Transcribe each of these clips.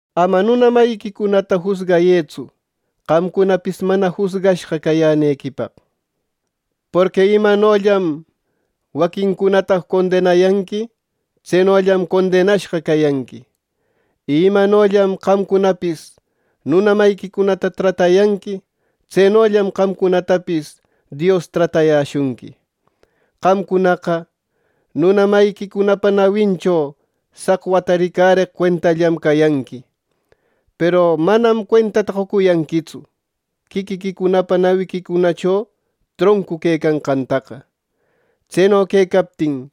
“Ama nuna mayiquicunata jusgayëtsu, qamcunapis mana jusgashqa cayänequipaq. Porqui imanollam waquincunata condenayanqui, tsenollam condenashqa cayanqui; y imanollam qamcunapis nuna mayiquicunata tratayanqui, tsenollam qamcunatapis Dios tratayäshunqui. Qamcunaqa nuna mayiquicunapa nawincho saqwata ricarëcaq cuentallam cayanqui; peru ¡manam cuentata qocuyanquitsu quiquiquicunapa nawiquicunacho troncu quecanqantaqa! Tseno quecaptin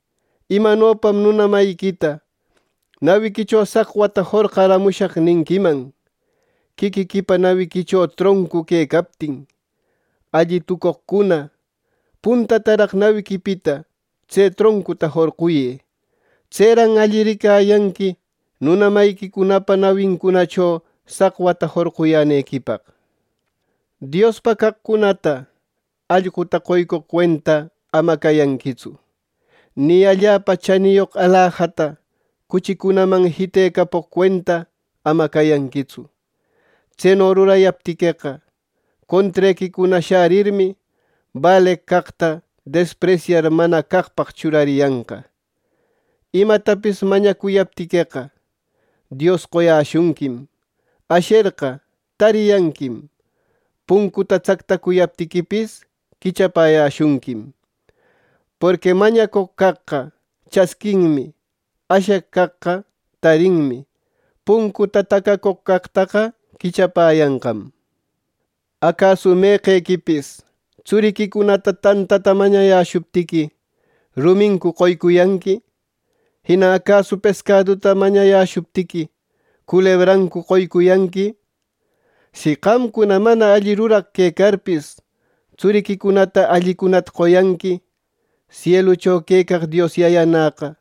¿imanopam nuna mayiquita ‘Nawiquicho saqwata jorqaramushaq’ ninquiman, quiquiquipa nawiquicho troncu quecaptin! ¡Alli tucoqcuna, puntataraq nawiquipita tse troncuta jorquyë! Tseran alli ricayanqui nuna mayiquicunapa nawincunacho saqwata jorqayänequipaq. “Diospa caqcunata allquta qoycoq cuenta ama cayanquitsu, ni allapa chaniyoq alajata cuchicunaman jitecapoq cuenta ama cayanquitsu. Tseno rurayaptiqueqa, contrequicuna sharirmi, baleq caqta despresyar mana caqpaq churariyanqa. “¡Imatapis mañacuyaptiqueqa, Dios qoyäshunquim! ¡Asherqa, tariyanquim; puncuta tsactacuyaptiquipis, quichapäyäshunquim! Porqui mañacoq caqqa chasquinmi; asheq caqqa tarinmi; puncuta tacacoq caqtaqa quichapäyanqam. “¿Acasu meqequipis tsuriquicuna tantata mañayäshuptiqui, rumincu qoyanqui! Jina ¿acasu pescaduta mañayäshuptiqui, culebrancu qoycuyanqui! Si qamcuna mana alli ruraq quecarpis tsuriquicunata allicunata qoyanqui, sielucho quecaq Dios Yayanäqa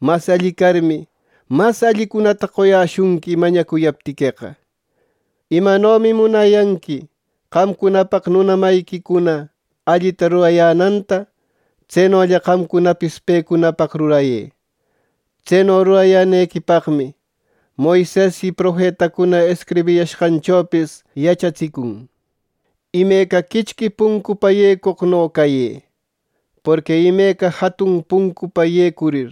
mas alli carmi, mas allicunata qoyäshunqui mañacuyaptiqueqa. “Imanomi munayanqui qamcunapaq nuna mayiquicuna allita rurayänanta, tsenolla qamcunapis pecunapaq rurayë. Tseno rurayänequipaqmi, Moises y profetacuna escribiyashqanchopis yachatsicuyarqan. “¡Imeca quichqui puncupa yecoqno cayë! Porqui imeca jatun puncupa yecurir,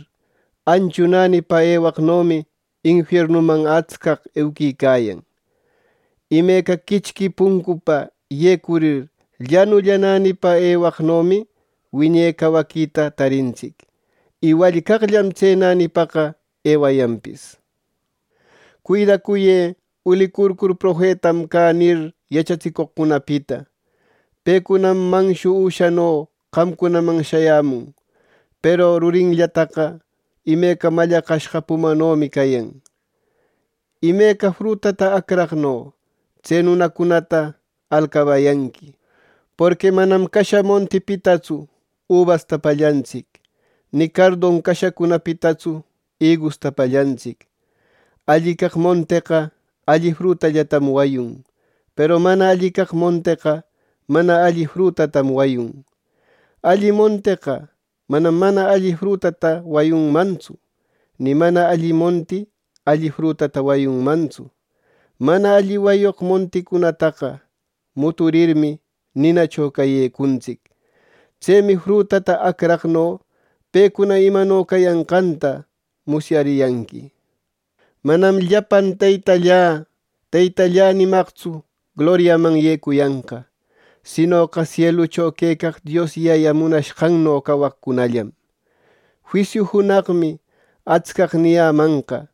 anchu nänipa ewaqnomi infiernuman atscaq euquicayan. Imeca quichqui puncupa yecurir, llanulla nänipa ewecaqnomi wiñe cawaquita tarintsic, y wallcaqllam tse nänipaqa ewayanpis. “Cuidacuyë ulicurcur ‘Profetam cä’ nir, yachatsicoqcunapita. Pecunam manshu üshano qamcunaman shayämun, peru rurillantaqa imeca mallaqashqa pumanomi cayan. Imeca frutata acraqno tse nunacunata alcabayanqui. Porqui manam casha montipitatsu ubasta pallantsic; ni cardon cashacunapitatsu igusta pallantsic. Alli caq monteqa alli frutallatam wayun; peru mana alli caq monteqa mana alli frutatam wayun. Alli monteqa manam mana alli frutata wayunmantsu; ni mana alli monti alli frutata wayunmantsu. Mana alli wayoq monticunataqa muturirmi, ninacho cayecuntsic. Tsemi frutata acraqno pecuna imano cayanqanta musyariyanqui. “Manam llapan ‘Teytallä, Teytallä’ nimaqnïtsu gloriaman yecuyanqa; sinoqa sielucho quecaq Dios Yayä munashqanno cawacoqcunallam. Juisiu junaqmi atscaq niyämanqa: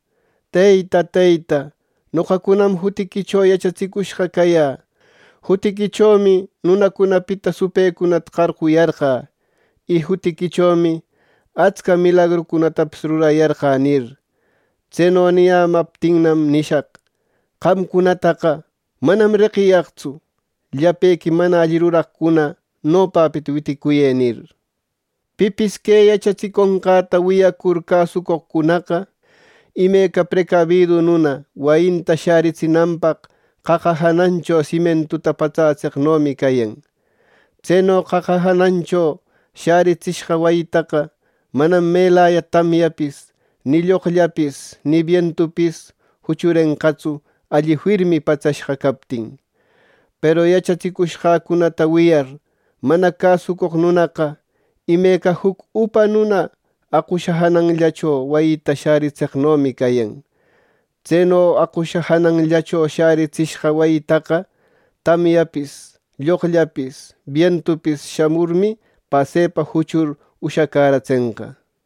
‘Teyta, Teyta, noqacunam jutiquicho yachatsicushqa cayä; jutiquichomi nunacunapita supëcunata qarquyarqä; y jutiquichomi atsca milagrucunatapis rurayarqä’ nir. Tseno niyämaptinnam nishaq: ‘¡Qamcunataqa manam reqiyaqtsu! ¡Llapequi mana alli ruraqcuna, nopapita witicuyë!’ nir. “Pipis que yachatsiconqäta wiyacur, cäsucoqcunaqa, imeca precabidu nuna wayinta shäritsinanpaq qaqa janancho simientuta patsätseqnomi cayan. Tseno qaqa janancho shäritsishqa wayitaqa manam melaya tamyapis ni lloqllapis ni bientupis juchurenqatsu alli firmi patsashqa captin. Peru yachatsicushqäcunata wiyar, mana cäsucoq nunaqa imeca juc upa nuna aqusha jananllacho wayita shäritseqnomi cayan. Tseno aqusha jananllacho shäritsishqa wayitaqa tamyapis, lloqllapis, bientupis shamurmi, pasepa juchur ushacäratsenqa” nir.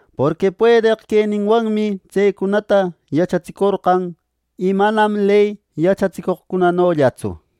Porqui puedeq queninwanmi tsecunata yachatsicorqan y manam ley yachatsicoqcunanollatsu.